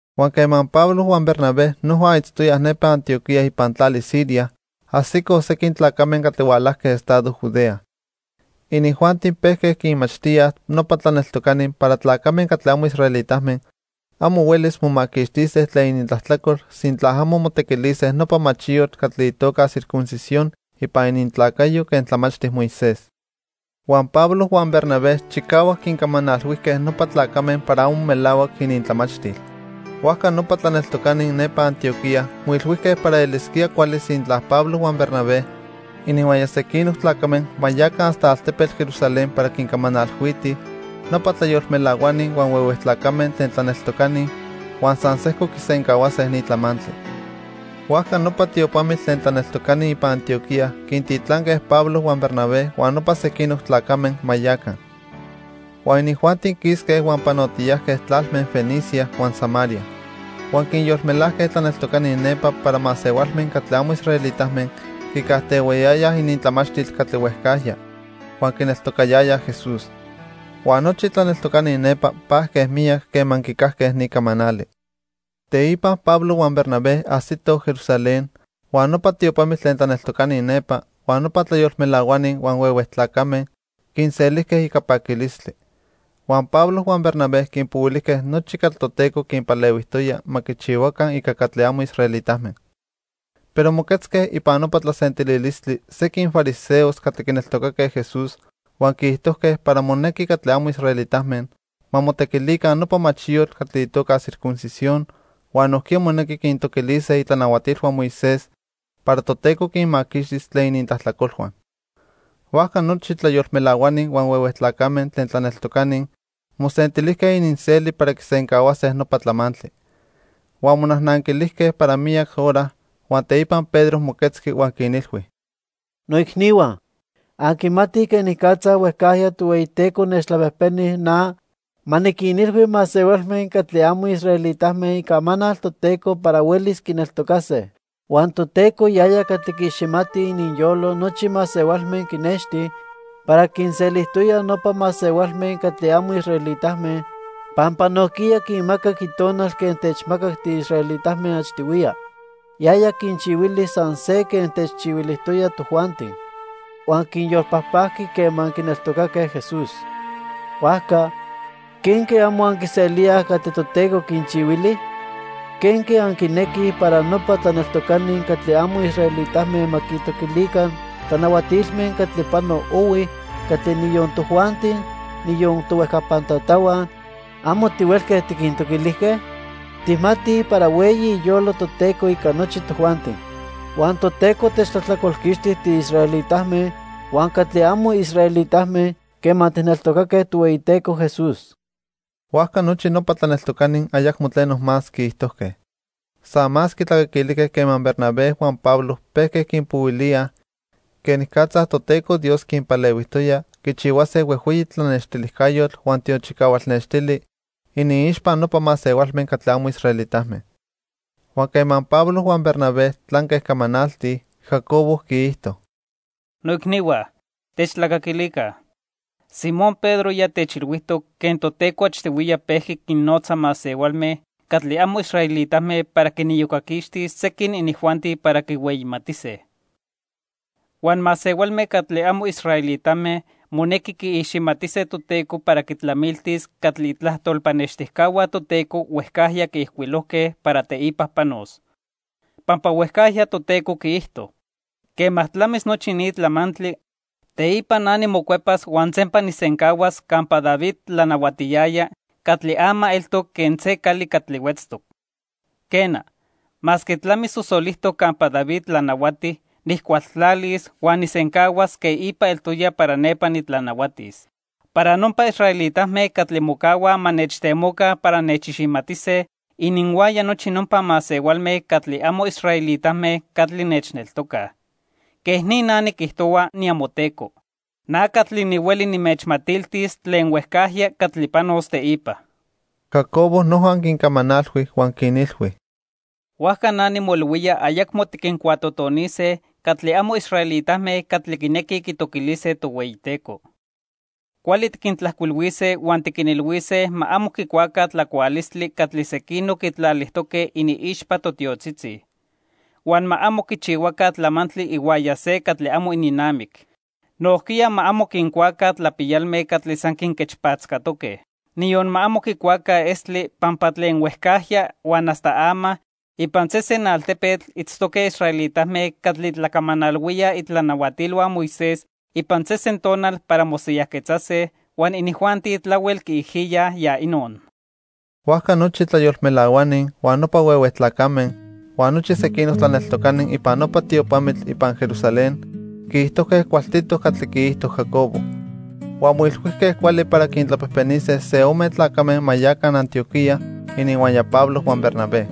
Huan quema Pablo huan Bernabé noja itztoyaj nepa Antioquía ipan tlali Siria, ajsicoj sequin tlacame catli hualajque estado Judea. Inijuanti pejque quinmachtíaj nopa tlaneltocani para tlacame catli amo israelitame amo huelis momaquixtise tlen inintlajtlacol sintla amo motequilise nopa machiyotl catli itoca circuncisión ipan inintlacayo quen tlamachti Moisés. Huan Pablo huan Bernabé chicahuac quincamanalhuijque nopa tlacame para amo melahuac inintlamachtil. Huajca nopa tlaneltocani nepa Antioquía moilhuijque para elisquía cuali sintla Pablo huan Bernabé ininhuaya sequinoc tlacame ma yaca hasta altepetl Jerusalén para quincamanalhuitij nopa tlayolmelahuani huan huehue tlacame tlen tlaneltocani, huan san sejco quisencahuase ni tlamantli. Huajca nopa tiopamitl tlen tlaneltocani ipan Antioquía quintitlanque Pablo huan Bernabé huan nopa sequinoc tlacame ma yaca. Huan inijuanti quisque huan panotiyajque tlalme Fenicia huan Samaria. Huan quinyolmelajque tlaneltocani nepa para masehualme catli amo israelitame quicajtehuayayaj inintlamachtil catli huejcajya huan quineltocayayaj Jesús. Huan nochi tlaneltocani nepa pajque miyac quema quicajque ni camanali. Teipa Pablo huan Bernabé ajsitoj Jerusalén huan nopa tiopamitl tlen tlaneltocani nepa, huan nopa tlayolmelahuani huan huehue tlacame quinselijque ica paquilistli. Huan Pablo huan Bernabé quinpohuilijque nochi catli Toteco quinpalehuijtoya ma quichihuaca ica catli amo israelitame. Pero moquetzque ipan nopa tlasentililistli sequin fariseos catli quineltocaque Jesús huan quiijtojque para monequi catli amo israelitame ma motequilica nopa machiyotl catli itoca circuncisión huan nojquiya monequi quintoquilise itlanahuatilhua Moisés para Toteco quinmaquixtis tlen inintlajtlacolhua. Huajca nochi tlayolmelahuani huan huehue tlacame tlen tlaneltocani mosentilijque ininseli para quisencahuase nopa tlamantli. Huan monajnanquilijque para miyac hora, huan teipa Pedro moquetzqui huan quinilhui: —Noicnihua, anquimatij quenicatza huejcajya Tohueyiteco nechtlapejpeni na ma niquinilhui masehualme catli amo israelitame icamanal Toteco para huelis quineltocase. Huan Toteco yaya catli quiiximati ininyolo nochi masehualme quinexti para quinselijtoya nopa masehualme catli amo israelitame pampa nojquiya quinmacac Itonal quen techmacac tiisraelitame achtihuiya. Yaya quinchihuili san se quen techchihuilijtoya tojuanti, huan quinyolpajpajqui quema quineltocaque Jesús. Huajca ¿quenque amo anquiselíaj catli Toteco quinchihuili? ¿Quenque anquinequij para nopa tlaneltocani catli amo israelitame ma quintoquilica tlanahuatilme catli pano ohui catli niyon tojuanti, niyon tohuejcapan tatahua, amo tihuelque tiquintoquilijque? Tijmatij para hueyi iyolo Toteco ica nochi tojuanti. Huan Toteco techtlajtlacolquixti tiisraelitame huan catli amo israelitame quema tijneltocaque Tohueyiteco Jesús. Huajca nochi nopa tlaneltocani ayacmo tleno más quiijtojque. San más quitlacaquilijque quema Bernabé huan Pablo pejque quinpohuilíaj quenicatza Toteco Dios quinpalehuijtoya quichihuase huejhueyi tlanextilijcayotl huan tiochicahual nextili iniixpa nopa masehualme catli amo israelitame. Huan quema Pablo huan Bernabé tlanque camanaltij, Jacobo quiijto: —Noicnihua, techtlacaquilica. Simón Pedro ya techilhuijtoc quen Toteco achtihuiya pejqui quinnotza masehualme catli amo israelitame para quiniyocaquixtis sequin inijuanti para quihueyimatise. Huan masehualme catli amo israelitame monequi quiiximatise Toteco para quitlamiltis catli itlajtol pannextijcahua Toteco huejcajya quiijcuilojque para teipa panos. Pampa huejcajya Toteco quiijto: 'Quema tlamis nochi ni tlamantli, teipa na nimocuepas huan sempa nijsencahuas campa David tlanahuatiyaya catli ama eltoc quen se cali catli huetztoc. Quena, masque tlamisosolijtoc campa David tlanahuati, nijcualtlalis huan nijsencahuas quen ipa eltoya para nepa nitlanahuatis. Para nopa israelitame catli mocahuaj ma nechtemoca para nechiximatise, ininhuaya nochi nopa masehualme catli amo israelitame catli nechneltocaj. Quej ni na niquijtohua, niamoTeco. Na catli nihueli nimechmatiltis tlen huejcajya catli panos teipa.' Jacobo noja quincamanalhui huan quinilhui: —Huajca na nimoilhuía ayacmo tiquincuatotonise catli amo israelitame catli quinequij quitoquilise Tohueyiteco. Cuali tiquintlajcuilhuise huan tiquinilhuise ma amo quicuaca tlacualistli catli sequinoc quitlalijtoque iniixpa totiotzitzi. Huan ma amo quichihuaca tlamantli ihuaya se catli amo ininnamic. Nojquiya ma amo quincuaca tlapiyalme catli san quinquechpatzcatoque. Niyon ma amo quicuaca estli, pampa tlen huejcajya huan hasta ama ipan sesen altepetl itztoque israelitame catli tlacamanalhuíaj itlanahuatilhua Moisés ipan sesen tonal para mosiyajquetzase huan inijuanti tlahuel quiijiyaj ya inon. Huajca nochi tlayolmelahuani, huan nopa huehue tlacame, huan nochi sequinoc tlaneltocani ipan nopa tiopamitl ipan Jerusalén quiijtojque cualtitoc catli quiijto Jacobo. Huan moilhuijque cuali para quintlapejpenise se ome tlacame ma yaca Antioquía ininhuaya Pablo huan Bernabé.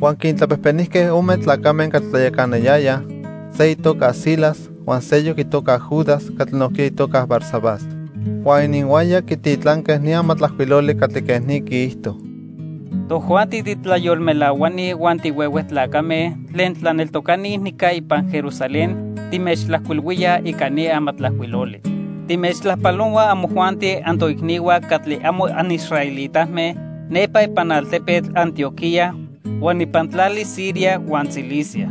Huan quintlapejpenijque ome tlacame catli tlayacanayayaj, se itoca Silas huan seyoc itoca Judas catli nojquiya itoca Barsabás. Huan ininhuaya quititlanque ni amatlajcuiloli catli quej ni quiijto: Tojuanti titlayolmelahuani huan tihuehue tlacame tlen tlaneltocani nica ipan Jerusalén timechtlajcuilhuíaj ica ni amatlajcuiloli. Timechtlajpalohuaj amojuanti antoicnihua catli amo anisraelitame nepa ipan altepetl Antioquía huan ipan tlali Siria huan Cilicia.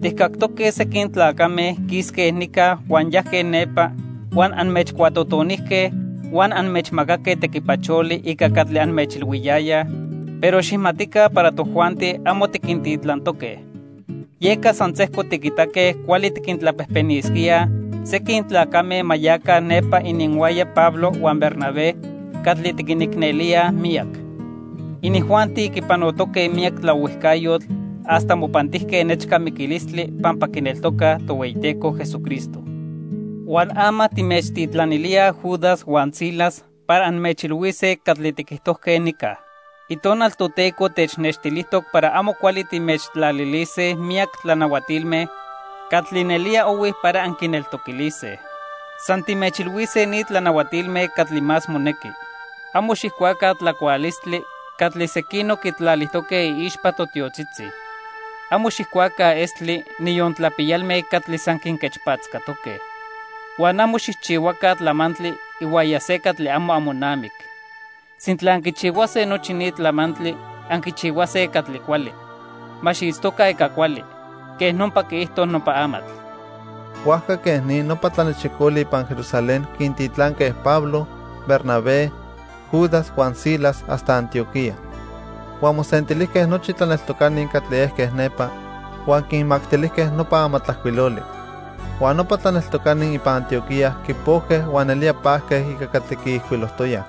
Tijcactoque sequin tlacame quisque nica huan yajque nepa huan anmechcuatotonijque huan anmechmacaque tequipacholi ica catli anmechilhuiyayaj, pero xijmatica para tojuanti amo tiquintitlantoque. Yeca san sejco tiquitaque cuali tiquintlapejpenisquíaj sequin tlacame ma yaca nepa ininhuaya Pablo huan Bernabé catli tiquinicnelíaj miyac. Inijuanti quipanotoque miyac tlaohuijcayotl hasta mopantijque nechca miquilistli pampa quineltocaj Tohueyiteco Jesucristo. Huan ama timechtitlanilíaj Judas huan Silas para anmechilhuise catli tiquijtojque nica. Itonal Toteco technextilijtoc para amo cuali timechtlalilise miyac tlanahuatilme catli nelía ohui para anquineltoquilise. San timechilhuise ni tlanahuatilme catli más monequi: Amo xijcuaca tlacualistli catli sequinoc quitlalijtoque iixpa se totiotzitzi. Amo xijcuaca estli, niyon tlapiyalme catli san quinquechpatzcatoque. Huan amo xijchihuaca tlamantli ihuaya se catli amo amonamic. Sintla anquichihuase nochi ni tlamantli, anquichihuase catli cuali. Ma xiitztoca ica cuali. Quej nopa quiijto nopa amatl. Huajca quej ni nopa tlanechicoli ipan Jerusalén quintitlanque Pablo, Bernabé, Judas huan Silas hasta Antioquía. Huan mosentilijque nochi tlaneltocani catli ejque nepa, huan quinmactilijque nopa amatlajcuiloli. Huan nopa tlaneltocani ipan Antioquía quipojque huan nelía pajque ica catli quiijcuilojtoyaj.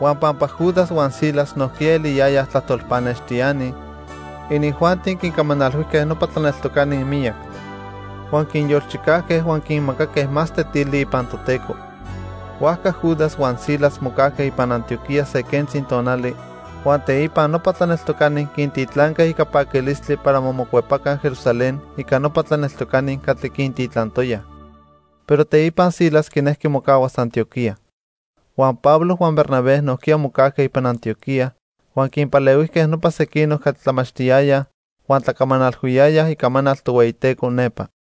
Huan pampa Judas huan Silas nojquiya eliyayaj tlajtol pannextiani, inijuanti quincamanalhuijque nopa tlaneltocani miyac; huan quinyolchicajque huan quinmacaque más tetili ipan Toteco. Huajca Judas huan Silas mocajque ipan Antioquía se quentzi tonali, huan teipa nopa tlaneltocani quintitlanque ica paquilistli para ma mocuepaca Jerusalén ica nopa tlaneltocani catli quintitlantoyaj. Pero teipa Silas quinejqui mocahuas Antioquía. Huan Pablo huan Bernabé nojquiya mocajque ipan Antioquía huan quinpalehuijque nopa sequinoc catli tlamachtiyayaj huan tlacamanalhuiyayaj icamanal Tohueyiteco nepa.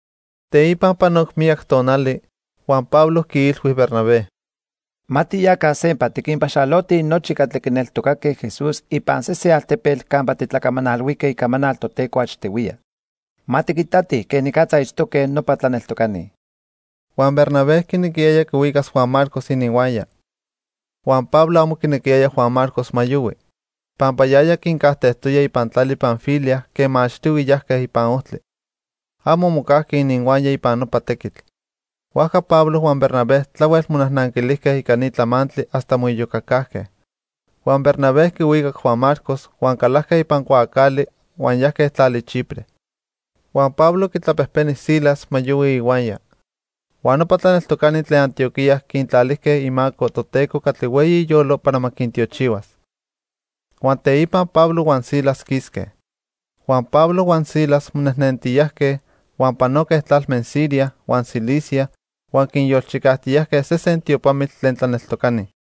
Teipa panoc miyac tonali, huan Pablo quiilhui Bernabé: —Ma tiyaca sempa, tiquinpaxalotij nochi catli quineltocaque Jesús ipan sesen altepetl campa titlacamanalhuijque icamanal Toteco achtihuiya. Ma tiquitatij quenicatza itztoque nopa tlaneltocani. Huan Bernabé quinequiyaya quihuicas Juan Marcos ininhuaya, huan Pablo amo quinequiyaya Juan Marcos ma yohui, pampa yaya quincajtejtoya ipan tlali Panfilia quema achtihui yajque ipan ojtli. Amo mocajqui ininhuaya ipan nopa tequitl. Huajca Pablo huan Bernabé tlahuel monajnanquilijque ica ni tlamantli hasta moiyocacajque. Huan Bernabé quihuicac Juan Marcos huan calajque ipan cuaacali huan yajque tlali Chipre. Huan Pablo quitlapejpeni Silas ma yohui ihuaya. Huan nopa tlaneltocani tlen Antioquía quintlalijque imaco Toteco catli hueyi iyolo para ma quintiochihuas. Huan teipa Pablo huan Silas quisque. Huan Pablo huan Silas nejnentiyajqui; huan panoque tlalme Siria huan Cilicia huan quinyolchicajtiyajque sesen tiopamitl tlen tlaneltocani.